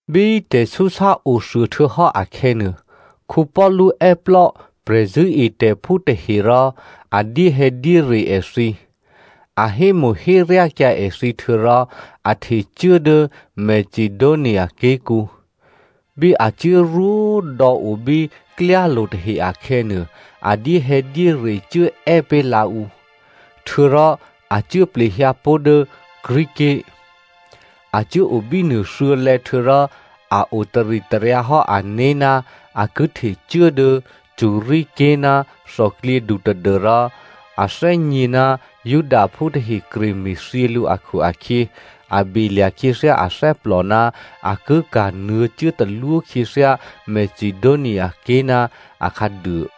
Bí tè̤súsá othuô htuô̌hò́ akhè̌nuô, Paulu è́plò́ prè̤zṳ̂́etè̤phú tahe rò a dyéhè̌dyére èthǐ, a hémo̤héryákyǎ èthǐ htuô̌rò a htecuố dố Macedonia ké̤kǔ. Bí a cuốrwó dò̌ o bí klyálo̤ tahe akhè̌nuô, a dyéhè̌dyére cuố è́pé̤ lǎ ǔ. Htuô̌rò a cuố plehyǎ pó̤ dố Greece ké̤. A cuốo bínuô thuô̌lè̌ htuô̌rò a o taritaryǎhò́ ané̤ ná a ki htecuố dố Syria ké̤ ná thòklyědu tadû́rò a thè́gně ná Judaphú tahe kre me̤thyě lǔ akhu-akhyě, a belya̤ khyěthyá athè́plò ná a ki kanuô̌ cuốtalwó khyěthyá Macedoniaké̤ ná akhǎduô.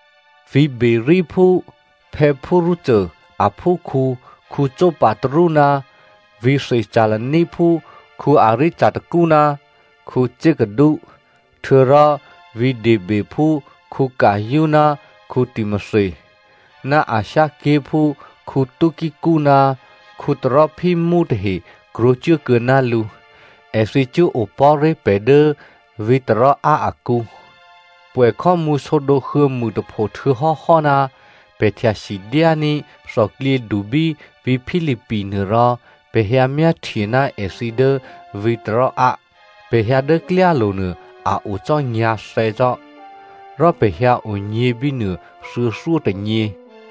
Vǐ̤ Beroeaphú Pyrrho aphúkhǔ Sopater ná vǐ̤ Thessaloniaphú Aristarko ná Secundo, htuô̌rò vǐ̤ Derbephú Gaio, ná Timothy, ná Asia ké̤phú Tykico ná Trophimo tahe krwǒcuố kuô̌ná lǔ. Èthǐ cuốopò̤́ré̤ pè̤ dố vǐ̤ Troa akǔ. Pwè̌ khò́mǔ sǒdǒ huô̌mûtapho htuô̌hò́hò́ná, pè̤ htyasidyání̤ thòklyědu bí vǐ̤ Philippi nuô rò pè̤ hyǎmyáhtye ná èthǐ dố vǐ̤ Troa. Pè̤ hyǎ dố klyálo̤ nuô a o cò́ nyǎ̤thè̌ cò́. Rò pè̤ hyǎ onyě̤ bínuô thuô̌thyótônyě.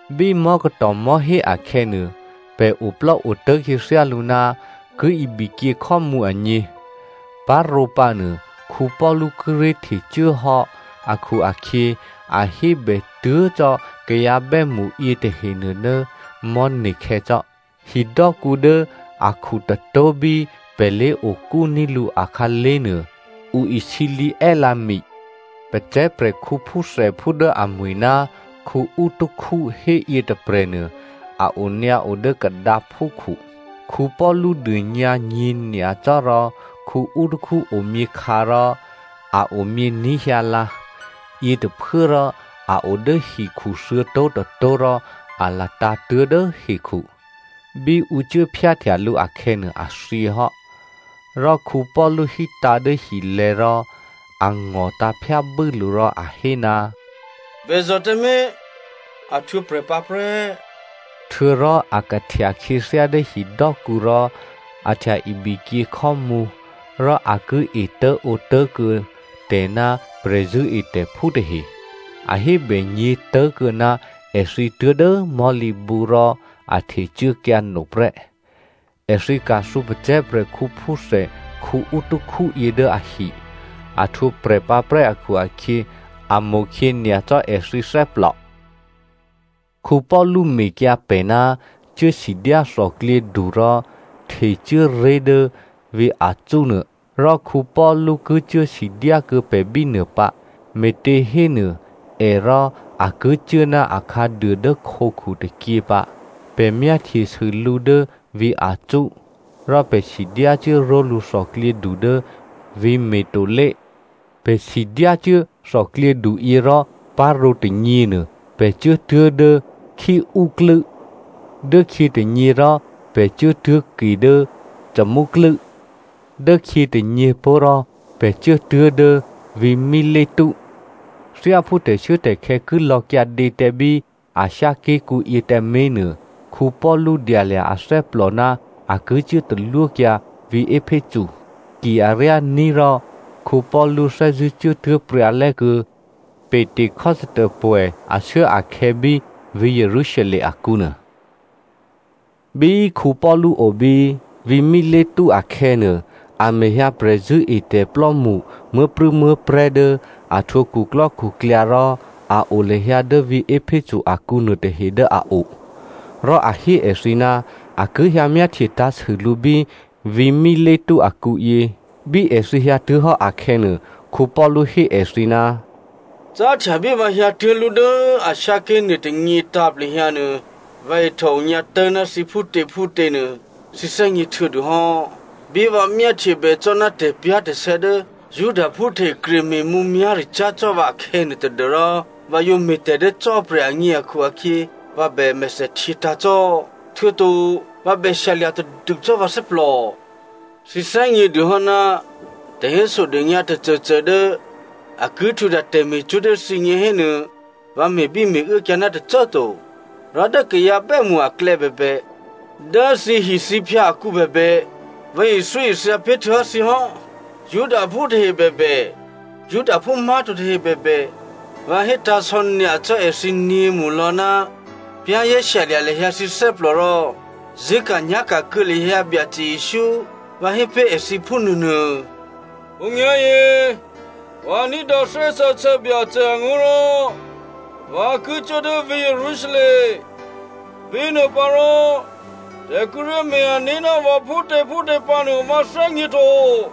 Bí mò̤́katò̤ mò̤́hé akhè̌nuô, pè̤ oplò́otố̤ khyěthyálǔ ná ki ibikyě khò́mǔ agně. Parǒpǎ nuô Paulu kíré̤ htecuốhò́ akhu-akhyě a hébè tuố̤ cò́ kayǎ bè́mṳ yětahenuô dố mò̤́ne̤khè̌ cò́. Hidò́kǔ dố akhutôtó̤ bí pè̤ lé̤okúní̤ lǔ akhǎlé̤ nuô, ǔ isǐlǐ è́lǎ mi. Pacè̤̌ prè̤khǔ phúthèphú dố amwi̤ ná Eutyko héyě tôprè̤nuô a onyǎo dố kadǎphúkhu. Paulu dônyǎ nyě̤nyacò́ rò Eutyko omyěkhǎ rò a omyění̤ hyǎlǎ. Yětôphuốrò a odố hikhu thuô̌tó̤tôtó̤ rò a latǎ̤ tuố̤dố hekhu. Bí ǔ cuố phyáhtya lǔ akhè̌nuô, a thyěhò́. Rò Paulu hítǎ̤ dố hilè̤̌ rò a ngò̤tǎ̤ phyábû́ lǔ rò a hé, “Bèzò̤ tǎmé̤. A htwǒprè̤pǎ prè́!” Htuô̌rò a kahtya khyěthyá dố hidò́kǔ rò a htya-ibikyě khò́mǔ rò a ki etố̤ǒtố̤kuô̌ tè̤ ná prè̤zṳ̂́etè̤phú tahe. A hébènyě̤ tố̤kuô̌ ná èthǐ tuố̤dố mò̤́lǐbǔ rò a htecuốkyǎ no prè́. Èthǐ ka̤thǔ pacè̤̌ prè̤khǔphúthè Eútychus yě dố ahi. A htwǒprè̤ pǎprè́ akhu-akhyě, a mo̤khyě nyacò́ èthǐ thè́plò. Paulu mekyǎ pè̤ ná cuốsidyá thòklyědu rò htecuố ré̤ dố vǐ̤ Asso nuô, rò Paulu ki cuố sidyá kuô̌ pè̤ bínuô pǎ. Me̤těhénuô è rò a ki cuố ná akhǎduô dố khǒkhu tôkyě pǎ. Pè̤ myáhtyesû lǔ dố vǐ̤ Asso, rò pè̤ sidyácuố ró̤lǔ thòklyědu dố vǐ̤ Mitylene. Pè̤ sidyá cuố thòklyěduyě rò parǒ tônyěnuô, pè̤ cuốtuố̤ dố Chio klû́. Dốkhyětônyě rò pè̤ cuốtuố̤ke dố Samo klû́. Dốkhyětônyě pó̤ rò pè̤ cuốtuố̤ dố vǐ̤ Mileto. Thyáphú tè̤shuốtè̤khè̌ ki lò̌kyǎdě tǎ bí Asia ké̤kǔ yě tǎmé̤nuô, Paulu dyalya̤ athè́plò ná a ki cuố talwókyǎ vǐ̤ Epheso. Ki aryání̤ rò Paulu thè́zṳ̂́ cuốtuố̤ pryǎlè́ kuô̌ Pentecostopwè̌ ashuốakhè̌ bí vǐ̤ Jerusalem akǔnuô. Bí Paulu obí vǐ̤ Mileto akhè̌nuô, a mehyǎ prè̤zṳ̂́etè̤plò́mṳ muố̤prû̌muố̤prè̤́ dố a htwǒ khuklò́khuklyǎ rò a o lahyǎ dố vǐ̤ Epheso akǔ nuôtahe dố a o. Rò a hé èthǐ ná a ki hyǎ myáhtye tǎ̤sû lǔ bí vǐ̤ Mileto akǔyě. Bí èthǐ hyǎtuố̤hò́ akhè̌nuô, Paulu hé èthǐ, “Cáhtya bí vǎ hyǎtuố̤lú dố Asia ké̤ nuôtônyě tǎ̤plehyǎnuô, vǎ ihtòonyǎ tố̤ná thǐ phútěphútěnuô thǐ thè́gně htuô̌dûhò́. Bí vǎ myáhtyebè cò́ ná tè̤pyá̤tè̤sè̌ dố Judaphú tahe kreme̤ mǔmyá̤ricyá̤ cò́ vǎ akhè̌nuô tadû́rò vǎ yǒ me̤tè̤ dố Cò́marya agně akhu-akhyě vǎ bè mèthèhtyě tǎ̤ cò́. Htuô̌to vǎ bè shyalya̤ tadû cò́ vǎ thè́plò. Thǐ thè́gnědûhò́ ná tè̤hésodônyǎ tôcôcô dố a ki htwǒhtya tè̤me̤cwó̤ dố thǐgně hénuô, vǎ me̤bíme̤uốkyǎ ná tôcô꤮ to. Rò dố kayǎ bè́mṳ aklè̌ bèbè, dố thǐhithǐphyǎ akǔ bèbè, vǎ ithyóithya pé̤ htuô̌hò́ thǐ hò́. Judaphú tahe bèbè, Judaphú má̤to tahe bèbè, vǎ hétǎ̤sò̌ nyacò́ èthǐ nyě̤mṳlò̌, za̤ ní̤dû lahyǎ thǐné̤ rò zṳ̂́ka̤nyá̤ka̤ kuô̌ lahyǎ Byacè Jesǔ, vǎ hé pé̤ èthǐ phúnuô nuô. “Khǒnyá̤yě, vǎ ní̤dǎ Thè́ Sǎsè̌ Byacè angó̤ rò vǎ ki cuố dố vǐ̤ Jerusalem. Bínuôpǎrò tè̤ kíré̤ me̤-ané̤ ná vǎ phútěphútě pǎnuô, vǎ thè́gněto.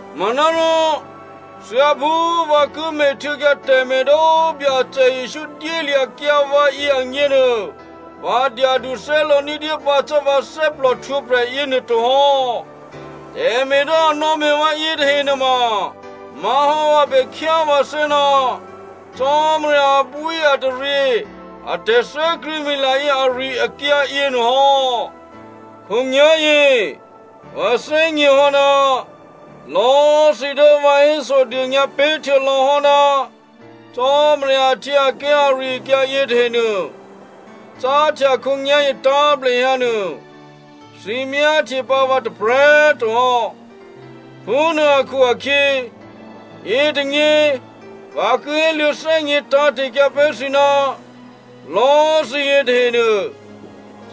Manárò thyáphú vǎ ki me̤htuô̌kyǎ tè̤me̤ dố Byacè Jesǔ dyélya̤kyǎ vǎyě agněnuô, vǎ dyadu thè́lǒ ní̤dyé pǎ cò́ vǎ thè́plò htwǒprè̤ yěnuô to hò́. Tè̤me̤ dố a nò̌me̤ vǎ yětahe nuôma má̤hò́ vǎ bè khyá vǎthè́ ná Cò́marya abwíataryě a tè̤thè́krṳ̂̌mila yě ari-akyǎ yěnuô hò́. “Khǒnyá̤yě vǎ thè́gněhò́ ná lò̌꤮ thǐ dố vǎ hésodônyǎ pé̤htuô̌ lò̤́hò́ ná Cò́marya ahtyěaké̤ ari-akyǎ yětahe nuô, cáhtya khǒnyá̤yě tǎ̤plehyǎ nuô thǐ myáhtye pǎ vǎ tôprè̤꤮ to hò́. Phúnuô akhu-akhyě, yětônyě, vǎ ki héluô̌ thè́gně tǎ̤te̤kyǎ pé̤ thǐ ná lò̌꤮ thǐ yětahenuô,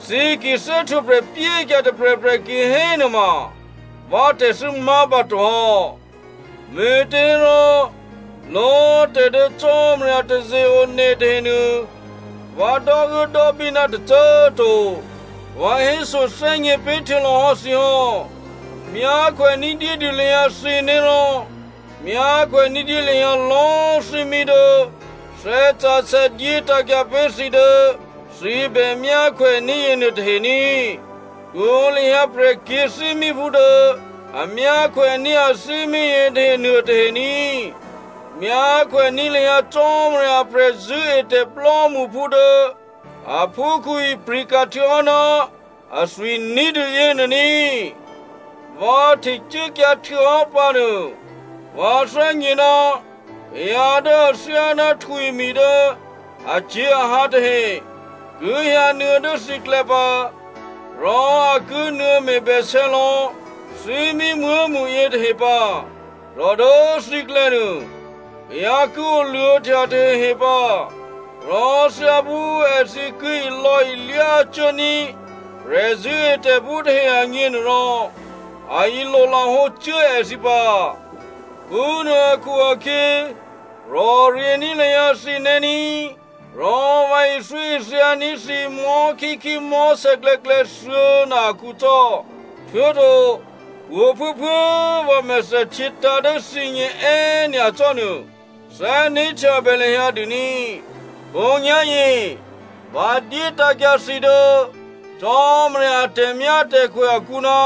thǐ ki thè́htwǒprè̤ pyékyǎ tôprè̤prè̤ kihénuôma vǎ tè̤thû́ má̤ pǎto hò́. Me̤těhérò lò̌꤮ tè̤ dố Cò́marya taze-one tahenuô, vǎ dò́uốdò́bí ná tôcô꤮ to. Vǎ hésothè́gně pé̤ htuô̌lò̌hò́ thǐ hò́. Myákhwè ní̤dyédû lahyǎ thǐné̤ rò myákhwè ní̤dyé lahyǎ lò̌꤮ thímí dố Thè́ Sǎsè̌ dyétǎ̤kyǎ pé̤ thǐ dố thǐ bè myákhwèní̤ yěnuô tahe ní꤮. Htwǒ lahyǎ prè̤kyě̤thímíphú dố a myákhwèní̤ athímí yětahe nuô tahe ní꤮. Myákhwèní̤ lahyǎ Cò́marya a prè̤zṳ̂́etè̤ plò́mṳphú dố aphúkhǔ ipri̤ka̤ htuô̌hò́ ná athwi ní̤dû yěnuô ní꤮. Vǎ htecuốkyǎ htuô̌hò́ pǎnuô, vǎ thè́gně ná kayǎ dố a thyá ná htwimi̤ dố acyě̤ahǎ tahe ki hyǎnuô̌ dố thǐklè̌ pǎ, rò a ki nuô̌me̤bèsè̌ lò̌ thímí muố̤mṳ yětahe pǎ. Rò dố thǐklè̌nuô kayǎ ki oluô̌htya tahehe pǎ. Rò thyáphú èthǐ ki ilò̌ilyá cuốní̤ prè̤zṳ̂́etè̤phú tahe agně nuôrò, a ilolahǒ cuố èthǐ pǎ. Phúnuô akhu-akhyě, rò̤ryě̤ní̤ lahyǎ thǐné̤ ní꤮. Rò vǎ ithyóithyaní̤ thǐ mò̤́khíkhí mò̤́sè̌klè̌klè̌ thuô̌na akǔ cò́. Htuô̌to pwǒ̤꤮ phuốphuố꤮ vǎ mèthèhtyětǎ̤ dố thǐgně è́nyacò́nuô thè́né̤htyabè lahyǎ dûní꤮. “Khǒnyá̤yě, vǎ dyétǎ̤kyǎ thǐ dố Cò́marya a tè̤myátè̤khwè akǔ ná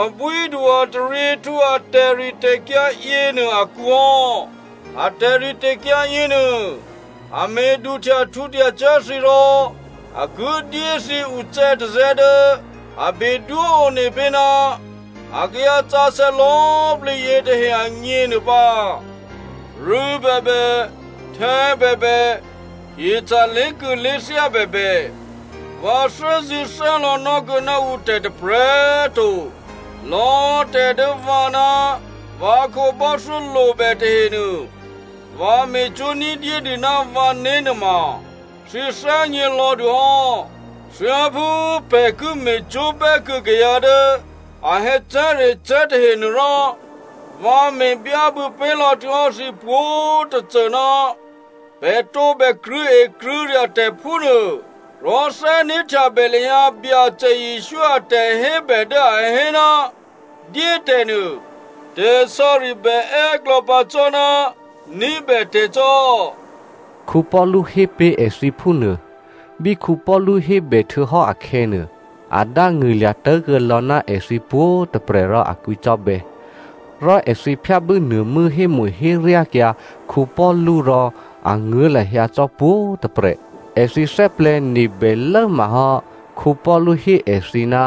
abwídu-ataryěhtǔ a tè̤ritè̤kyǎ yěnuô akǔ hò́. A tè̤ritè̤kyǎ yěnuô a me̤duhtyahtǔhtya cyá̤ thǐ rò a ki dyé thǐ ucè̌tazè̌ dố a bedwó one pé̤ ná a kayǎsǎsè̌ lò̌꤮ plǐ yětahe agně nuô pǎ. Rû̌ bèbè, htè̌ bèbè, hyeca̤ lé̤kû̌lé̤thyá bèbè, vǎ thè́zṳ̂́thè́lò̌ nò́kuô̌ ná ǔtè̤ tôprè̤꤮ to. Lò̌꤮ tè̤ dố vǎ ná vǎ khǒbò́thyó lobè tahenuô, vǎ me̤cwó̤ ní̤dyédû ná vǎné̤ nuôma thǐ thè́gně lò̌dûhò́. Thyáphú pè̤ ki me̤cwó̤ bè́kuô̌ kayǎ dố a hè̌cè̤́recè̤́ tahenuôrò, vǎ me̤ byábû̌ pé̤lò̌ htuô̌hò́ thǐ pwǒ̤꤮ tôcô ná pè̤ tǒbè krṳ̂̌ekrṳ̂̌rya̤ tè̤, phúnuô. Rò thè́né̤htyabè lahyǎ Byacè Jesǔ a tè̤hébè dố a hé, ‘Dyétè̤ nuô tè̤sò̌ri bè è́klò̌ pǎ cò́ ná ní̤bètè̤ cò́,’” Paulu hé pé̤ èthǐ phúnuô. Bí Paulu hébèhtuô̌hò́ akhè̌nuô, a dángṳ̂lya̤ tố̤kuô̌lò̌ ná èthǐ pwǒ̤꤮ tôprè̤ rò a kwǐcò́bè̌. Rò èthǐ phyábû́ nuô̤mû́ hémo̤héryákyǎ Paulu rò a nguố̤ lahyǎ cò́ pwǒ̤꤮ tôprè̤. Èthǐ thè́plè̤̌nebè lốmahò́ Paulu hé èthǐ ná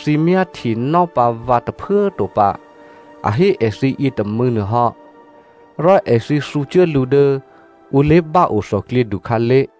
thǐ myáhtyenò́ pǎ vǎ tôphuố꤮ to pǎ, a hé èthǐ yětômû̌ nuôhò́. Rò èthǐ thǔcuố lǔ dố ǔ lé̤báo thòklyědu khǎlé̤.